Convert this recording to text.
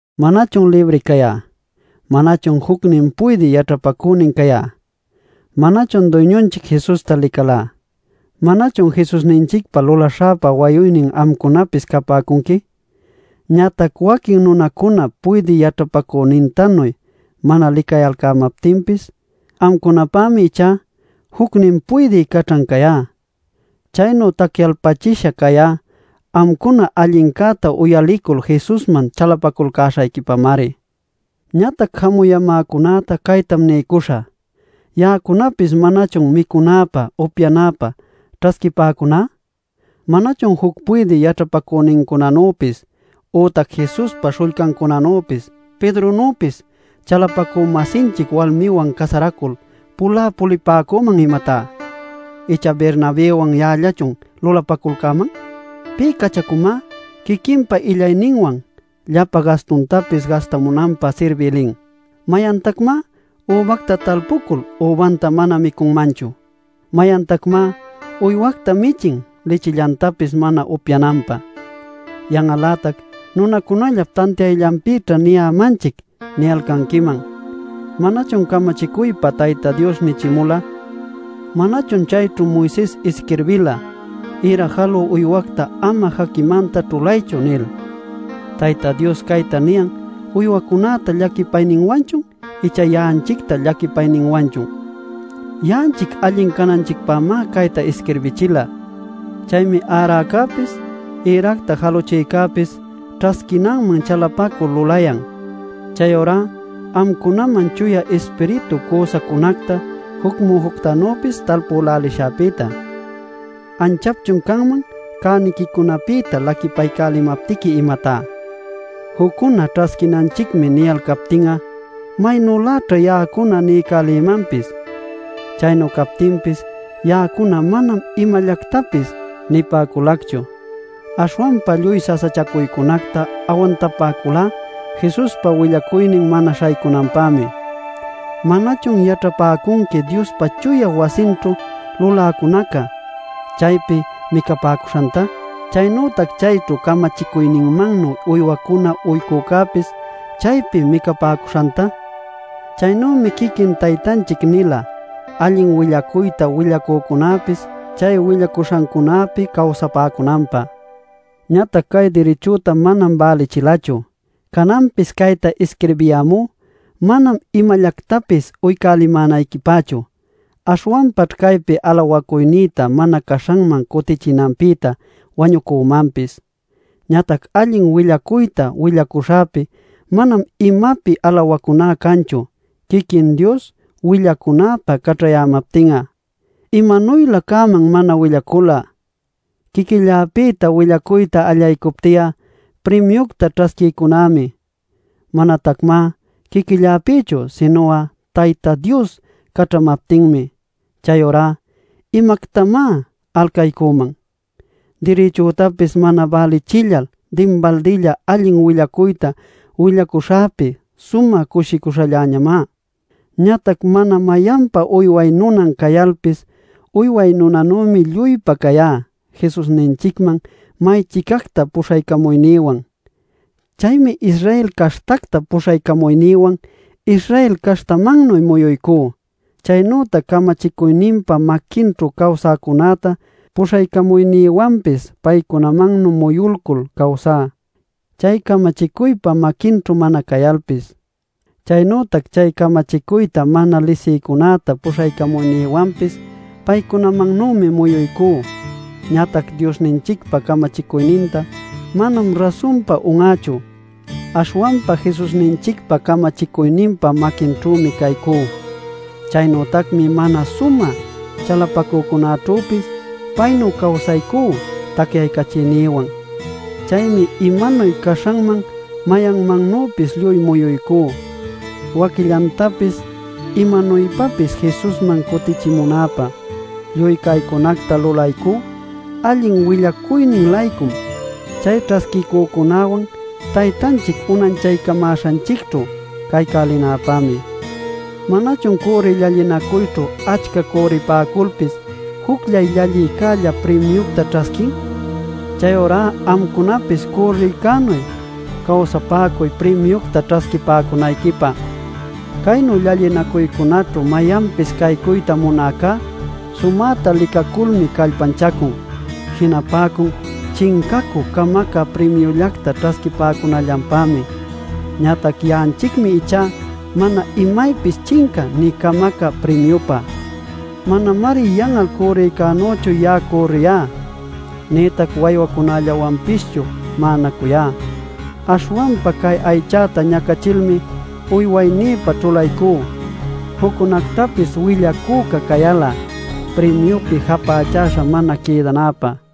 ¿Manachun libri cayá? ¿Manachun jucnin puydï yaćhapacünin cayá? ¿Manachun Duyñunchic Jesusta licalá? ¿Manachun Jesusninchicpä lulaśhäpa wayuynin amcunapis capäcunqui? Ñatac waquin nunacuna puydï yaćhapacünintanuy mana licayalcämaptinpis, amcunapämi ichá jucnin puydï caćhan cayá. Chaynu tacyalpachisha cayá amcuna allincäta uyalicul Jesusman chalapaculcäśhayquipamari. Ñatac jamuyämäcunäta caytam niycuśhä: Ya'acunapis ¿manachun micunäpä, upyanäpä ćhasquipäcuná? ¿Manachun juc puydï yaćhapacünincunanüpis ütac Jesuspa śhullcancunanüpis Pedronüpis chalapacü-masinchic walmiwan casaraculcul pulä pulipäcüman, imatá? ¿Icha Bernabëwan ya'allachun lulapaculcäman? ¿Pï cachacumá quiquinpa illayninwan llapa gastuctapis gastamunanpä sirbï lin? ¿Mayantacmá übacta talpucul übanta mana micunmanchu? ¿Mayantacmá uywacta michin lichillantapis mana upyananpä? Yan'al-lätac “Nunacunallap tantiayllanpïćha niyämanchic” niyalcanquiman. ¿Manachun camachicuypa Tayta Dios nichimula? ¿Manachun chayćhu Moises isquirbila: “Ïra jalü uywacta ama jaquimanta ćhulaychu” nil? ¿Tayta Dios cayta niyan uywacunäta llaquipayninwanchun, icha ya'anchicta llaquipayninwanchun? Ya'anchic allin cananchicpämá cayta isquirbichila. Chaymi äräcäpis, ïracta jaluchïcäpis ćhasquinanman chalapacul lulayan. Chayurá amcunaman Chuya Ispiritu cüsacunacta juc mujuctanüpis talpülälishäpïta ¿anchapchun canman cäniquicunapïta laquipaycälimaptiqui, imatá? Juccuna “ćhasquinanchicmi” niyalcaptin'a, ¿maynüläćha ya'acuná niycälïmanpis? Chaynu captinpis ya'acuna manam imallactapis nipäculacchu. Aśhwanpa lluy sasachacuycunacta awantapäculá Jesuspa willacuynin mana śhaycunanpämi. ¿Manachun yaćhapäcunqui Diospa chuya wasinćhu luläcunaca, chaypi micapäcuśhanta, chaynütac chayćhu camachicuyninmannuy uywacuna uycücäpis chaypi micapäcuśhanta? Chaynümi quiquin Taytanchic nila allin willacuyta willacücunäpis chay willacuśhancunäpi cawsapäcunanpä. Ñatac cay dirichüta manam bälichilächu. Cananpis cayta isquirbiyämú manam imallactapis uycälimänayquipächu. Aśhwanpaćh caypi alawacuynïta mana caśhanman cutichinanpïtá wañücümanpis. Ñatac allin willacuyta willacuśhäpi manam imapi alawacuná canchu quiquin Dios willacunäpä caćhayämaptin'a. ¡Imanuylä cäman mana willacul'a! Quiquilläpïta willacuyta allaycupti'a primiucta ćhasquiycunämi. Manatacmá quiquilläpïchu, sinu'a Tayta Dios caćhamaptinmi. Chayurá ¿imactamá alcaycüman? Dirichütapis mana bälichillal dinbaldilla allin willacuyta willacuśhäpi sumä cushicuśhalläñamá. Ñatac mana mayanpa uyway nunan cayalpis, uyway nunanümi lluypa cayá Jesusninchicman may-chicacta puśhaycamuynïwan. Chaymi Israel caśhtacta puśhaycamuynïwan Israel caśhtamannuy muyuycú. Chaynütac camachicuyninpa maquinćhu cawsäcunäta puśhaycamuynïwanpis paycunamannuy muyulcul cawsá, chay camachicuypa maquinćhu mana cayalpis. Chaynütac chay camachicuyta mana lisïcunäta puśhaycamuynïwanpis paycunamannümi muyuycú. Ñatac Diosninchicpa camachicuyninta manam rasunpa un'ächu, aśhwanpa Jesusninchicpa camachicuyninpa maquinćhümi caycú. Chaynütacmi mana sumä chalapacücunaćhüpis, paynu cawsaycú tacyaycachiynïwan. Chaymi imanuy caśhanman mayanmannüpis lluy muyuycú, waquillantapis imanuypapis Jesusman cutichimunäpä. Lluy caycunacta lulaycú allin willacuynin-laycum, chay ćhasquicücunäwan Taytanchic unanchaycamäśhanchicćhu caycälinäpämi. ¿Manachun cürriy llallinacuyćhu achca cürripäculpis jucllay llallïcälla primiucta ćhasquin? Chayurá amcunapis cürrïcänuy cawsapäcuy primiucta ćhasquipäcunayquipä. Caynu llallinacuycunaćhu mayanpis caycuyta munäcá, sumäta licaculmi callpanchacun. Jinapäcun chincacü camacä primiullacta ćhasquipäcunallanpämi. Ñatac ya'anchicmi ichá mana imaypis chincä nï camacä primiupá. Manamari yan'al cürrïcänüchu ya'a cürriyá, nïtac waywacunallawanpischu ma'anacuyá. Aśhwanpa cay aychäta ñacachilmi uywaynïpa ćhulaycú, juccunactapis willacüca cayal'a primiupi japächaśha mana quïdanäpä.